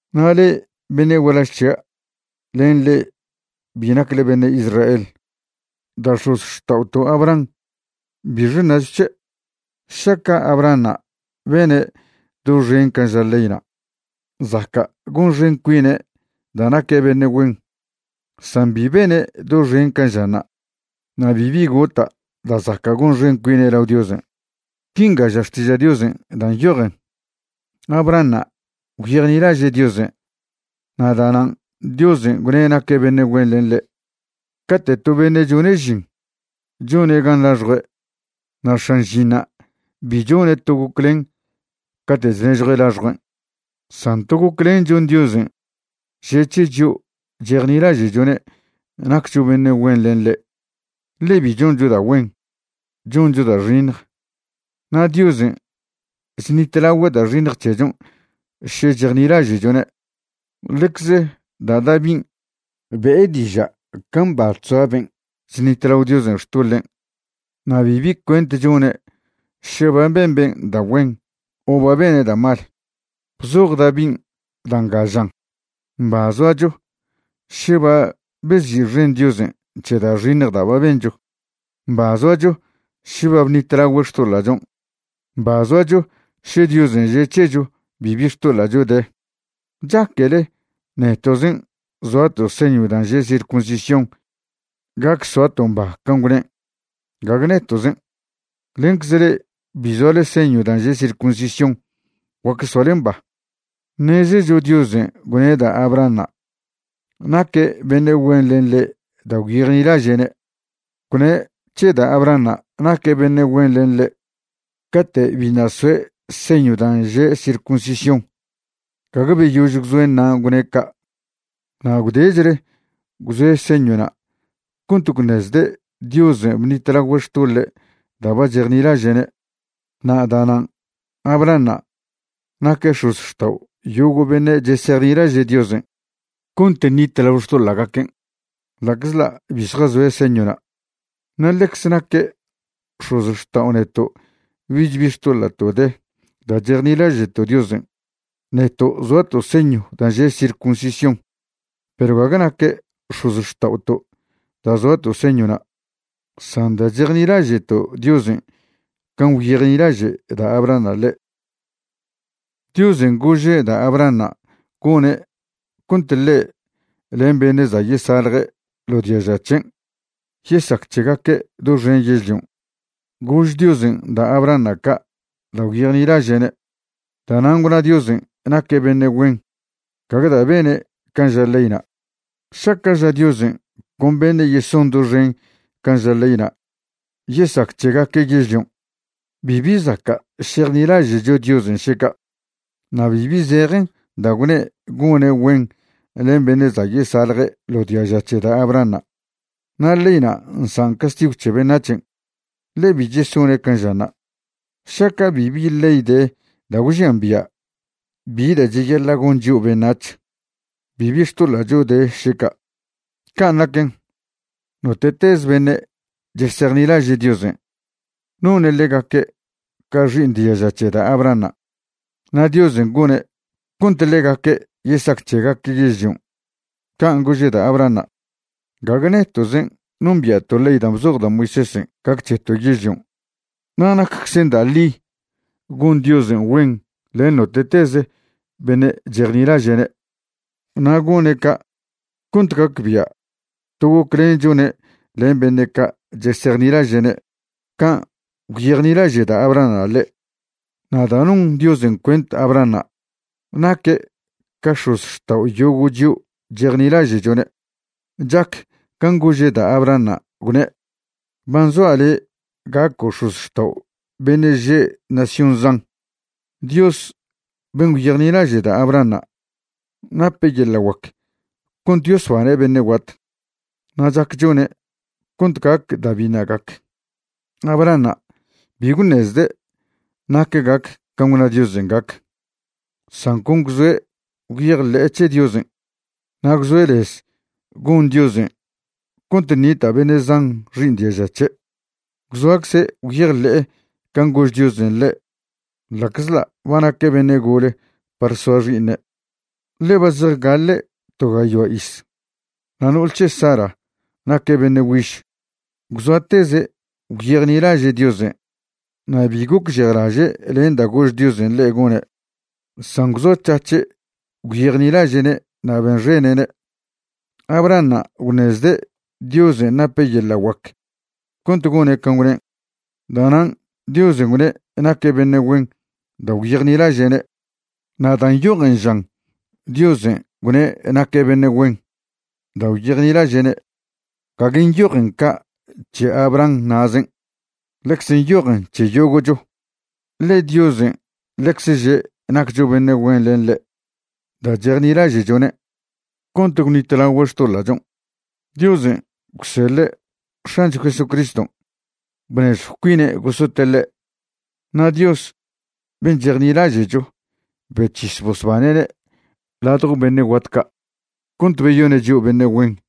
Na' le'e beṉe' gualaž c̱hia' len le'e bi nacle beṉe' Israel, da' x̱ozxta'oto' Abraham ¿bixe ṉacho c̱he'? Šaca' Abrahanṉa' bene' doxen can' ža leyna', zaca' gonxen cuine' da' naque' beṉe' güen, san bi bene' doxen can' žanṉa' na' bibi gota' da' zaca' gonxen cuine' lao Diosen'. Quinga ža Xtiža' Diosen' da' nyojen: “Abrahanṉa' gwyejnilaže' Diosen' na' da'nan' Diosen' gwne' naque' beṉe' güen len ḻe'.” Cate' to beṉe' chone' žin, chone' gan laxjue' na' x̱an žinṉa' bi chone' to goclen cate' chnežjue' laxjuen'. San to goclen chon Diosen' že' c̱he chio' chejnilaže'chone' naccho beṉe' güen len ḻe', ḻe bi choncho da' güen. Choncho da' xiṉj, na' Diosen' chṉitlagüe' da' xiṉj c̱hechon' še chejnilaže'chone'. Ḻecz da' Davin' be'e diža' ca mba chzoa ben' chṉitlao Diosen' xtoḻen' na' bibi cuent chone' še ba ben ben' da' güen o ba bene' da' mal. Bzoj Davin' da' nga žan: Mba zoacho še ba bezi'xen Diosen' c̱he da' xiṉj da' ba bencho. Mba zoacho še ba bṉitlagüe' xtoḻa'chon'. Mba zoacho še Diosen' že' c̱hecho bibi xtoḻa'cho de. ¿Chaquele neto'zen' zoato' señw dan' že' circuncisión gac soato' mba can' gwnen'? Gague neto'zen'. Lencze le'e bi zoale señw dan' že' circuncisión guac soale mba. Ṉezecho Diosen' gwne' da' Abrahanṉa' naque' beṉe' güen len ḻe' da' gwyejnilaže'ne'. Gwne' c̱he da' Abrahanṉa' naque' beṉe' güen len ḻe' cate' biṉa' soe' señw dan' že' circuncisión, gague beyož gwzoen'ṉa' gwne' ca'. Na' gwdechle gwzoe' señwna' cont gwṉezde' Diosen' bṉitlagüe' xtoḻe' da' ba chejnilaže'ne'. Na' da'nan' Abrahanṉa' naque' x̱ozxtao' yogo' beṉe' chesejnilaže' Diosen' cont ṉitlao xtoḻa'gaquen' ḻa'czḻa' bi zjazoe' señwna'. Na' ḻecze naque' x̱ozxtao' neto' bich bi xtoḻa'to' de da' chejnilaže'to' Diosen', neto' zoato' señw dan' že' circuncisión. Perw gague naque' x̱ozxta'oto' da' zoato' señwna', san da' chejnilaže'to' Diosen' can' gwyejnilaže' da' Abrahanṉa' ḻe'. Diosen' gože' da' Abrahanṉa' gone' cont ḻe' len beṉe' za' yesalje ḻo diaža' c̱hen' yesac c̱hegaque' doxen yežlion'. Gož Diosen' da' Abrahanṉa' ca' da' gwyejnilaže'ne'. Da'nan' gwna Diosen' naque' beṉe' güen gague da' bene' can' ža leyna'. Šaca' ža Diosen' con beṉe' yeson doxen can' ža leyna' yesac c̱hegaque' yežlion', bibi zaca' šejnilaže'cho Diosen' šeca', na' bibi zejen da' gwne' gone' güen len beṉe' za' yesalje ḻo diaža c̱he da' Abrahanṉa'. Na' leyna' nsan' castigw c̱he beṉac̱hen', ḻe bi chesone' can' žanṉa. Šaca' bibi ley de da' gwžian bia' bi da' cheyaḻa' gon chio' beṉac̱h, bibi xtoḻa'cho de šeca'. Can' naquen, note'teze beṉe' chesejnilaže' Diosen', none' ḻegaque' ca xi'iṉ diaža c̱he da' Abrahanṉa', na' Diosen' gone' cont ḻegaque' yesac c̱hegaque' yežlion' can' gože' da' Abrahanṉa'. Gague neto'zen' nombia'to' ley da' bzoj da' Moisésen' gac c̱heto' yežlion'. Na' nacczen da' ḻi gon Diosen' güen len note'tez beṉe' chejnilaže'ne'. Na' gone' ca' cont gacbia' to goclen chone' len beṉe' ca' chesejnilaže'ne' can' gwyejnilaže' da' Abrahanṉa' ḻe'. Na' da' non Diosen' cuent Abrahanṉa' naque' ca x̱ozxtao' yogo' chio' chejnilaže'chone', chac can' gože' da' Abrahanṉa' gwne': “Ba nzoa' le' gaco' x̱ozxtao' beṉe' še' nación zan.” Dios ben' gwyejnilaže' da' Abrahanṉa' nape' yeḻa' guac cont yosbane' beṉe' guat, na' chac chone' cont gac da' biṉa' gac. Abrahanṉa' bi gwṉezde' nac gac can' gwna' Diosen' gac, san con gwzoe' gwyejḻe'e c̱he Diosen' na' gwzoe' lez gon Diosen' cont ṉita' beṉe' zan xi'iṉ diaža' c̱he'. Gwzoacze' gwyejḻe'e can' gož Diosen' ḻe' ḻa'czḻa' ba naque' beṉe' gole par soa xi'iṉe', ḻe ba zejgaḻe' to gayoa iz, na' no'ol c̱he' Sara naque' beṉe' güiž. Gwzoateze' gwyejnilaže' Diosen' na' bi gocžejlaže' len da' gož Diosen' ḻe' gone', san gwzoac̱hac̱he' gwyejnilaže'ne' na' benxene'ne'. Abrahanṉa' gwṉezde' Diosen' nape' yeḻa' guac cont gone' can' gwnen'. Da'nan' Diosen' gwne' naque' beṉe' güen da' gwyejnilaže'ne'. Na' dan' nyojen žan Diosen' gwne' naque' beṉe' güen da' gwyejnilaže'ne', gague nyojen ca' c̱he Abraham na'zen'. Ḻecze nyojen c̱he yogo'cho, ḻe Diosen' ḻecze že' naccho beṉe' güen len ḻe' da' chejnilaže'chone'. Cont gwṉitlagüe' xtoḻa'chon' Diosen' gwseḻe' X̱ancho Jesucriston' bnežjw cuine' gosote' ḻe'. Na' Dios ben' chejnilaže'cho bec̱his bosbane'ne' ladjo beṉe' guat ca' cont beyone' chio' beṉe' güen.